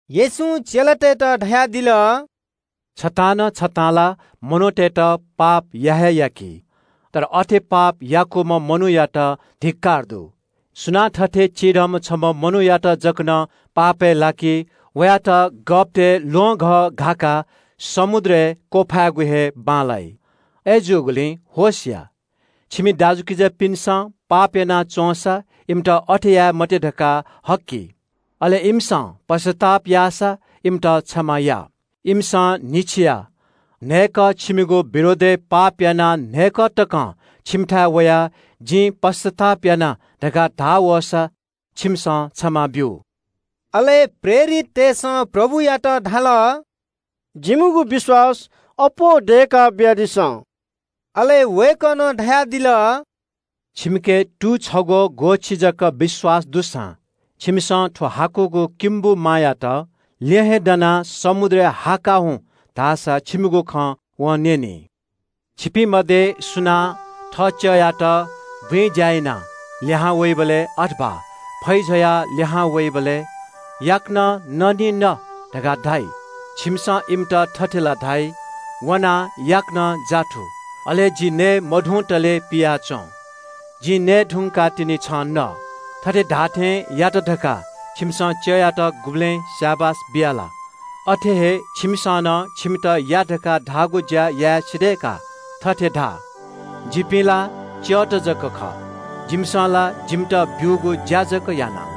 येशूं चेलातय्‌त धयादिल – “छतां न छतां ला मनूतय्‌त पाप या हे याकी, तर अथे पाप याकूम्‍ह मनूयात धिक्‍कार दु। सुनां थथे चिधंम्‍ह छम्‍ह मनूयात जक नं पापय् लाकी, वयात गःपतय् ल्‍वहंघः घाकाः समुद्रय् वांछ्वयेगु हे बांलाइ। अय्‌जूगुलिं होश या। “छिमि दाजुकिजापिन्‍सं पाप याना च्‍वंसा इमित अथे याये मते धकाः हक्‍कि। अले इमिसं पश्‍चाताप याःसा इमित क्षमा या। इमिसं न्‍हिच्‍छिइ न्‍हय्‌कः छिमिगु विरोधय् पाप यानाः न्‍हय्‌कः तकं छिमिथाय् वयाः ‘जिं पश्‍चाताप याये’ धकाः धाः वःसा छिमिसं क्षमा ब्‍यु।” अले प्रेरिततय्‌सं प्रभुयात धाल – “जिमिगु विश्‍वास अप्‍वः दय्‌का बियादिसँ।” अले वय्‌कलं धयादिल – “छिमिके तू छग्‍वःति जक विश्‍वास दुसां छिमिसं थ्‍व हाकुगु किम्‍बु मायात – ‘ल्‍यहेँ दनाः समुद्रय् ला हुँ’ धाःसा छिमिगु खँ वं न्‍यनी।” “छिपिं मध्‍ये सुनां थः च्‍यःयात बुँइ ज्‍या यानाः लिहां वइबलय् वा फैजवाः लिहां वइबलय् ‘याकनं न निं न’ धकाः धाइ ला? छिमिसं वयात थथे ला धाइ – ‘वनाः याकनं नयेगु ज्‍वरय् या, अले जि नये मधुंतले पियाच्‍वँ। जिं नये धुंकाः तिनि छं न।’ थथे धाःथें यात धकाः छिमिसं च्‍यःयात गुबलें स्‍याबास बिया ला? अथे हे छिमिसं नं छिमित या धकाः धाःगु ज्‍या याये सिधय्‌का थथे धा – ‘जिपिं ला च्‍यःत जक खः। जिमिसं ला जिमित ब्‍वःगु ज्‍या जक याना।’”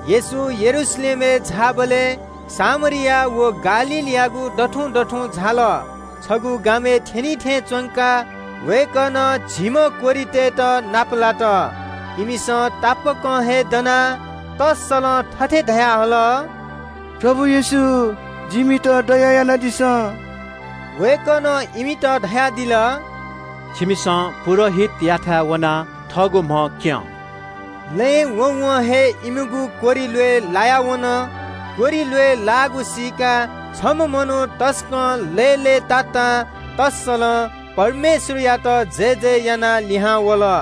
येशू यरूशलेमपाखे झाःबलय् सामरिया व गालीलयागु दथुं दथुं झाल। छगू गामय् थ्‍यनी थें च्‍वंकाः वय्‌कलं झिम्‍ह कोह्रितय्‌त नापलात। इमिसं तापाकं हे दनाः तःसलं थथे धयाहल – “प्रभु येशू, जिमित दया यानादिसँ।” वय्‌कलं इमित धयादिल – “छिमिसं पुजाहारीयाथाय् वनाः थःगु म्‍ह क्‍यनाब्‍यु।” लँय् वँवं हे इमिगु कोह्रि ल्‍वय् लाया वन। कोह्रि ल्‍वय् लाःगु सीकाः छम्‍ह मनू तसकं लय्‌लय्‌तातां तःसलं परमेश्‍वरयात जयजय यानाः लिहां वल।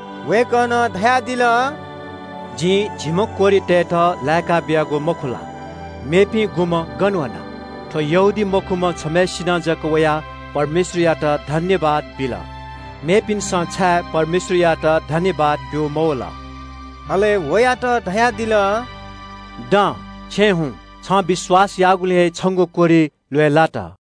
वय्‌कलं धयादिल – “जिं झिम्‍ह कोह्रितय्‌त लाय्‌का बियागु मखु ला? मेपिं गुम्‍ह गन वन? थ्‍व यहूदीमखुम्‍ह छम्‍हय्‌सिनं जक वयाः परमेश्‍वरयात सुभाय् बिल, मेपिन्‍सं छाय् परमेश्‍वरयात सुभाय् ब्‍यू मवल?” अले वयात धयादिल – “दँ, छेँय् हुँ। छं विश्‍वास याःगुलिं हे छंगु कोह्रि ल्‍वय् लात।”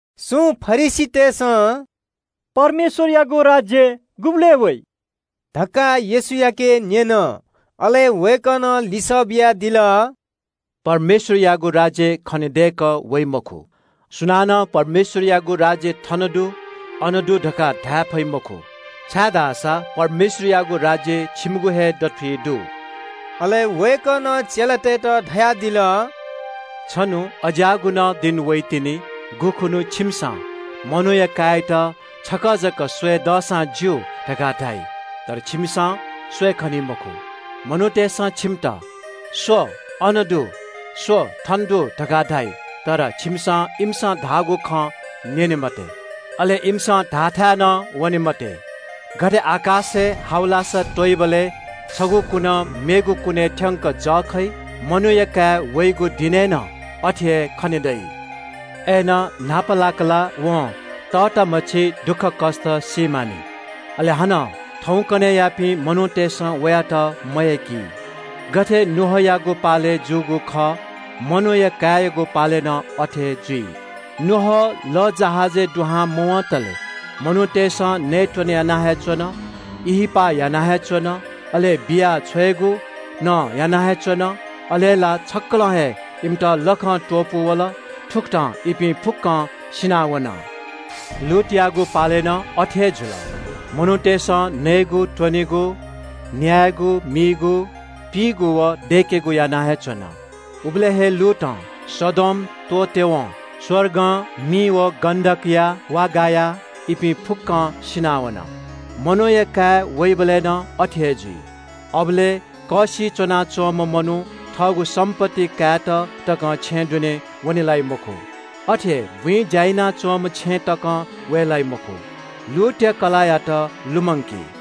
सुं फरिसीतय्‌सं परमेश्‍वरयागु राज्‍य गुबलय् वइ धकाः येशूयाके न्‍यन। अले वय्‌कलं लिसः बियादिल – “परमेश्‍वरयागु राज्‍य खनेदय्‌कः वइ मखु। सुनानं परमेश्‍वरयागु राज्‍य ‘थन दु’, ‘अन दु’ धकाः धाये फइ मखु, छाय्‌धाःसा परमेश्‍वरयागु राज्‍य छिकपिनिगु हे दथुइ दु।” अले वय्‌कलं चेलातय्‌त धयादिल – “छन्‍हु अज्‍याःगु नं दिं वइतिनि गुखुन्‍हु छिमिसं मनूया काय्‌यात छकः जक स्‍वये दःसां ज्‍यू, धकाः धाइ। तर छिमिसं स्‍वये खनी मखु। मनूतय्‌सं छिमित – ‘स्‍व, अन दु’, ‘स्‍व, थन दु’ धकाः धाइ। तर छिमिसं इमिसं धाःगु खँ न्‍यने मते, अले इमिसं धाःथाय् नं वने मते। गथे आकाशय् हावलासा त्‍वइबलय् छगू कुनं मेगु कुनय् थ्‍यंक जः खइ। मनूया काय् वइगु दिनय् नं अथे हे खने दइ। न्‍हापालाक ला वं तःतामछि दुःखकष्‍ट सी मानि। अले हानं थौंकन्‍हय्‌यापिं मनूतय्‌सं वयात मयय्‌की। “गथे नोआयागु पालय् जूगु खः मनूया काय्‌यागु पालय् नं अथे जुइ। नोआ लःजहाजय् दुहां मवंतले मनूतय्‌सं नयेत्‍वने याना हे च्‍वन, ब्‍याहा याना हे च्‍वन, अले बिया छ्वयेगु नं याना हे च्‍वन, अले ला छक्‍कलं हे इमित लखं त्‍वपू वल, थुकथं इपिं फुक्‍कं सिनावन। “लोतयागु पालय् नं अथे हे जुल। मनूतय्‌सं नयेत्‍वनेगु, न्‍यायेगु मीगु, पीगु व दय्‌केगु याना हे च्‍वन। उबलय् हे लोतं सदोम त्‍वःतेवं आकाशं मि व गन्‍धक गायाः इपिं फुक्‍कं सिनावन। मनूया काय् वइबलय् नं अथे हे जुइ। अबलय् कःसिइ च्‍वनाच्‍वंम्‍ह मनू थःगु सम्‍पत्ति कायेत तकं छेँय् दुने वने लाइ मखु। अथे हे बुँइ ज्‍या यानाच्‍वंम्‍ह छेँय् तकं वये लाइ मखु। लोतया कलाःयात लुमंकी।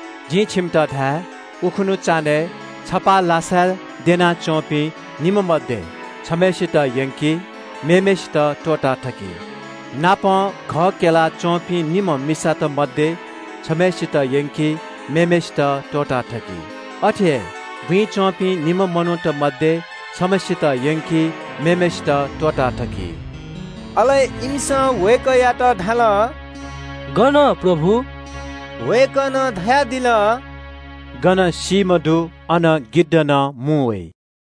जिं छिमित धाये – उखुन्‍हु चान्‍हय् छपाः लासाय् द्यनाच्‍वंपिं निम्‍ह मध्‍ये छम्‍हय्‌सित यंकी, मेम्‍हय्‌सित त्‍वःताथकी। नापं घः क्‍यला च्‍वंपिं निम्‍ह मिस्‍त मध्‍ये छम्‍हय्‌सित यंकी, मेम्‍हय्‌सित त्‍वःताथकी। अथे हे बुँइ च्‍वंपिं निम्‍ह मनूत मध्‍ये छम्‍हय्‌सित यंकी, मेम्‍हय्‌सित त्‍वःताथकी।” अले इमिसं वय्‌कःयात धाल – “गन प्रभु?” वय्‌कलं धयादिल – “गन सीम्‍ह दु अन गिद्ध नं मुं वइ।”